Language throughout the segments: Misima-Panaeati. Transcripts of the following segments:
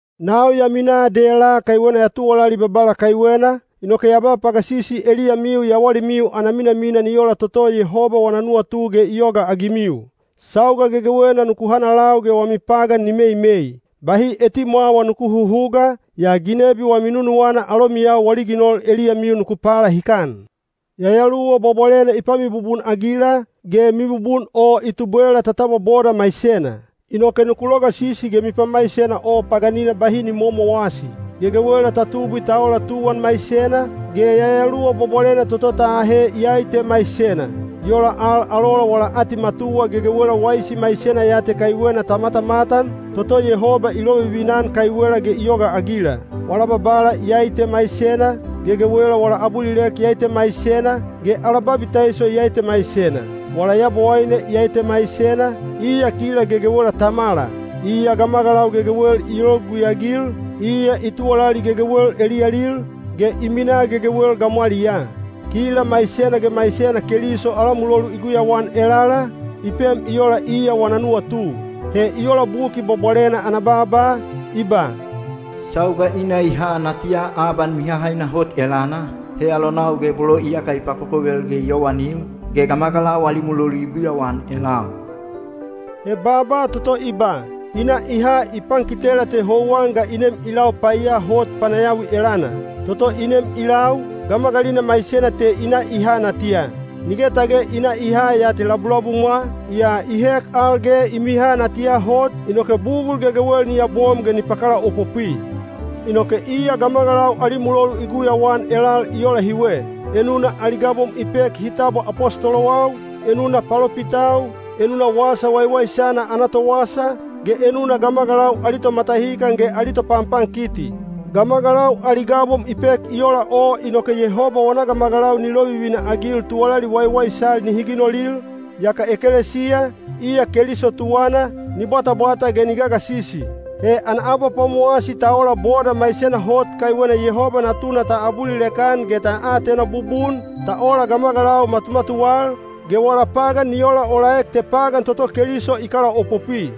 Nau ya minaa dela kaiwena ya tuwalali Babala kaiwena, inoke ya ba pagasisi eliyamiu yawalimiu ana minamina ni ola toto Yehoba wana nuwatu ge i yogaagimiu. Sauga gegewena nuku hanalau ge wami pagan ni meimei. Bahi etimwawa nuku huhuga, yaa ginebi wami nunuwana alomiyau wali ginol eliyamiu nuku palahikan. Yayaluwa Bwabwalena i pamibubun-agila, ge mibubun o i tubwela ta tabwa boda maisena. Inoke nuku logasisi ge mipamaisena o paganina bahi ni momowasi. Gegewela ta tubwi ta ola tuwan maisena, ge Yayaluwa Bwabwalena toto ta ahe iyai te maisena. I ola al, alola wala atimatuwa gegewela waisi maisena ya te kaiwena ta matamatan, toto Yehoba i lovivina-an kaiwela ge i yogaagila. Wala Babala iyai te maisena, gegewela wala abulilek iyai te maisena, ge ala babitaiso iyai te maisena. Wala Yabowaine iyai te maisena, iya kila gegewela Tamala. Iya gamagalau gegewel i logugui-agil, iya i tuwalali gegewel eliyalil, ge i minaa gegewel gamwaliyaa. Kila maisena ge maisena Keliso ala mulolu i guyauan elala, i pem i ola iya wana nuwatu. He i ola Buki Bwabwalena ana baaba, i ba, “Sauga i na i ha natiya aban mihahaina hot elana, he alonau ge bolo iyaka i pakokovel ge i yowanil, ge gamagalau ali mulolu i guyauan elal.” (He baaba toto i ba, “i na i ha” i pankitela te houwan ga i nem i lau paiya hot panayawi elana. Toto i nem i lau, gamagalina maisena te i na i ha natiya. Nige tage i na i ha ya te labulabumwa, yaa i hek al ge i miha natiya hot, inoke bugul gegewel ni yabom ge ni pakalaopopwi.) Inoke iya gamagalau ali mulolu i guyauan elal i ola hiwe. Enuna ali gabom i pek hi tabwa apostolowau, enuna palopitau, enuna Wasa Waiwaisana ana towasa, ge enuna gamagalau ali tomatahikan ge ali topanpankiti. Gamagalau ali gabom i pek i ola o inoke Yehoba wana gamagalau ni lovivina-agil tuwalali waiwaisal nihi ginolil, yaka ekelesiya, iya Keliso tuwana, ni bwatabwata ge ni gagasisi. He ana abapwamowasi ta ola boda maisena hot kaiwena Yehoba Natuna ta abulilek-an ge ta atena bubun, ta ola gamagalau matumatuwal, ge wala pagan ni olaolaek te pagan toto Keliso i kalaopopwi.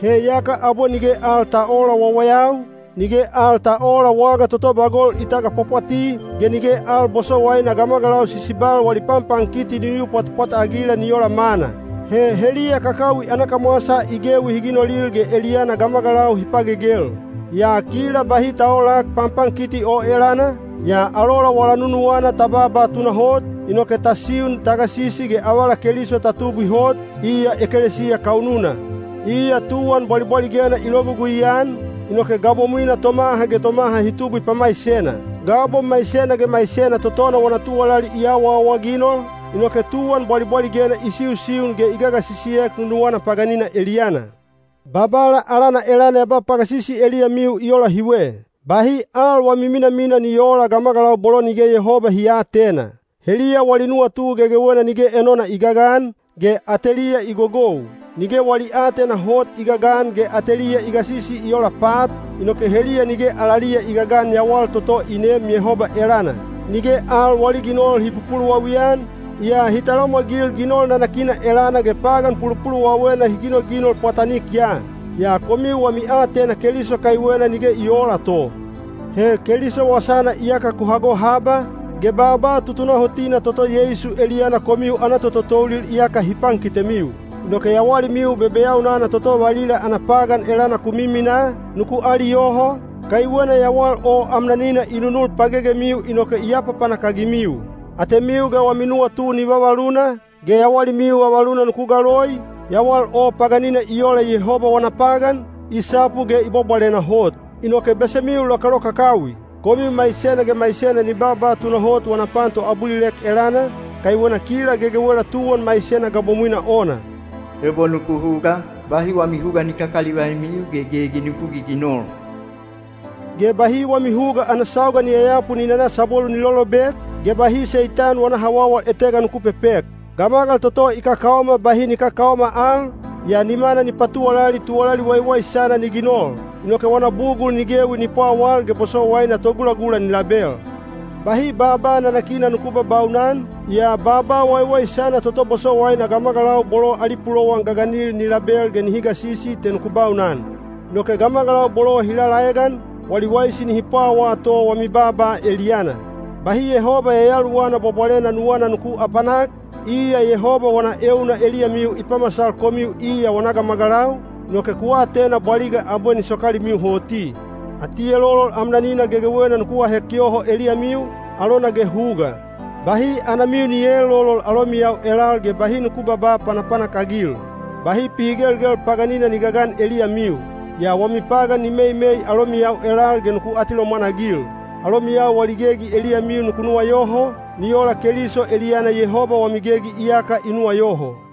He yaka abwe nige al ta oola wawayau, nige al ta oola waga toto bagol i tagapwapwati, ge nige al bosowaina gamagalau sisibal wali panpankiti ni yu pwatpwat-agila ni ola mana. He heliya kakawi ana kamwasa i gewi hi ginolil ge eliyana gamagalau hi pagegel. Yaa kila bahi ta oolak panpankiti o elana, yaa alola wala nunuwana ta baaba tunahot, inoke ta siun ta gasisi ge avala Keliso ta tubwi hot, iya ekelesiya kaununa. Iya tuwan bwalibwaligena i logugui-an, inoke gabomwina tomaha ge tomaha hi tubwi pamaisena. Gabom maisena ge maisena totona wana tuwalali i awaawaginol, inoke tuwan bwalibwaligena i siusiun ge i gagasisiek nunuwana paganina eliyana. Babala alana elana ya ba pagasisi eliyamiu i ola hiwe. Bahi al wami minamina ni oola gamagalau bolo nige Yehoba hi aatena. Heliya wali nuwatu gegewena nige enona i gagan, ge ateliya i gogou. Nige wali aatena hot i gagan ge ateliya i gasisi i ola pat, inoke heliya nige alaliya i gagan yawal toto i neem Yehoba elana. Nige al wali ginol hi pupuluwawi-an, yaa hi talamwagil ginol nanakina elana ge pagan pulupuluwawena hi ginoginol pwatanik ya. Yaa komiu wami aatena Keliso kaiwena nige i oola to. He Keliso wasana iyaka ku hago haba, ge baaba tutunahotina toto Yeisu eliyana komiu ana tototoulil iyaka hi pankitemiu. Inoke yawalimiu bebeyaunana toto valila ana pagan elana ku miminaa, nuku aliyoho, kaiwena yawal o amnanina i nunul pagegemiu inoke i apapanak-agimiu. Atemiu ge wami nuwatu ni vavaluna, ge yawalimiu vavaluna nuku galoi, yawal o paganina i ola Yehoba wana pagan, i sapu ge i bwabwalena hot. Inoke besemiu lokalokakawi! Komiu maisena ge maisena ni baaba tunahot wana pan toabulilek elana, kaiwena kila gegewela tuwan maisena gabomwina ona. Ebo nuku huga, bahi wami huga ni kakalivaimiu ge gegi nuku giginol. Ge bahi wami huga ana sauga ni yayapu ni nana sabwelu ni lolobek, ge bahi Seitani wana hawawal etega nuku pepek. Gamagal toto i kakaoma bahi ni kakaoma al, yaa nimana ni patuwalali tuwalali waiwaisana ni ginol. Inoke wana bugul ni gewi ni pwawal ge bosowaina togulagula ni label. Bahi baaba nanakina nuku babaunan, yaa baaba waiwaisana toto bosowaina gamagalau bolo ali pulowan gaganil ni label ge nihi gasisi te nuku baunan. Inoke gamagalau bolo hi lalaegan, wali waisi nihi pwawaa to wami baaba eliyana. Bahi Yehoba Yayaluwana Bwabwalena nuwana nuku apanak, iya Yehoba wana euna eliyamiu i pamasal komiu iya wana gamagalau, inoke ku atena bwaliga abwe ni sokalimiu hoti. Atielolol amnanina gegewena nuku ahek yoho eliyamiu, alona ge huga. Bahi anamiu ni eelolol alomiyau elal ge bahi nuku babaa panapanak-agil. Bahi pihigelgel paganina ni gagan eliyamiu. Yaa wami pagan ni meimei alomiyau elal ge nuku atilomwan-agil. Alomiyau wali gegi eliyamiu nuku nuwayoho, ni ola Keliso eliyana Yehoba wami gegi iyaka i nuwayoho.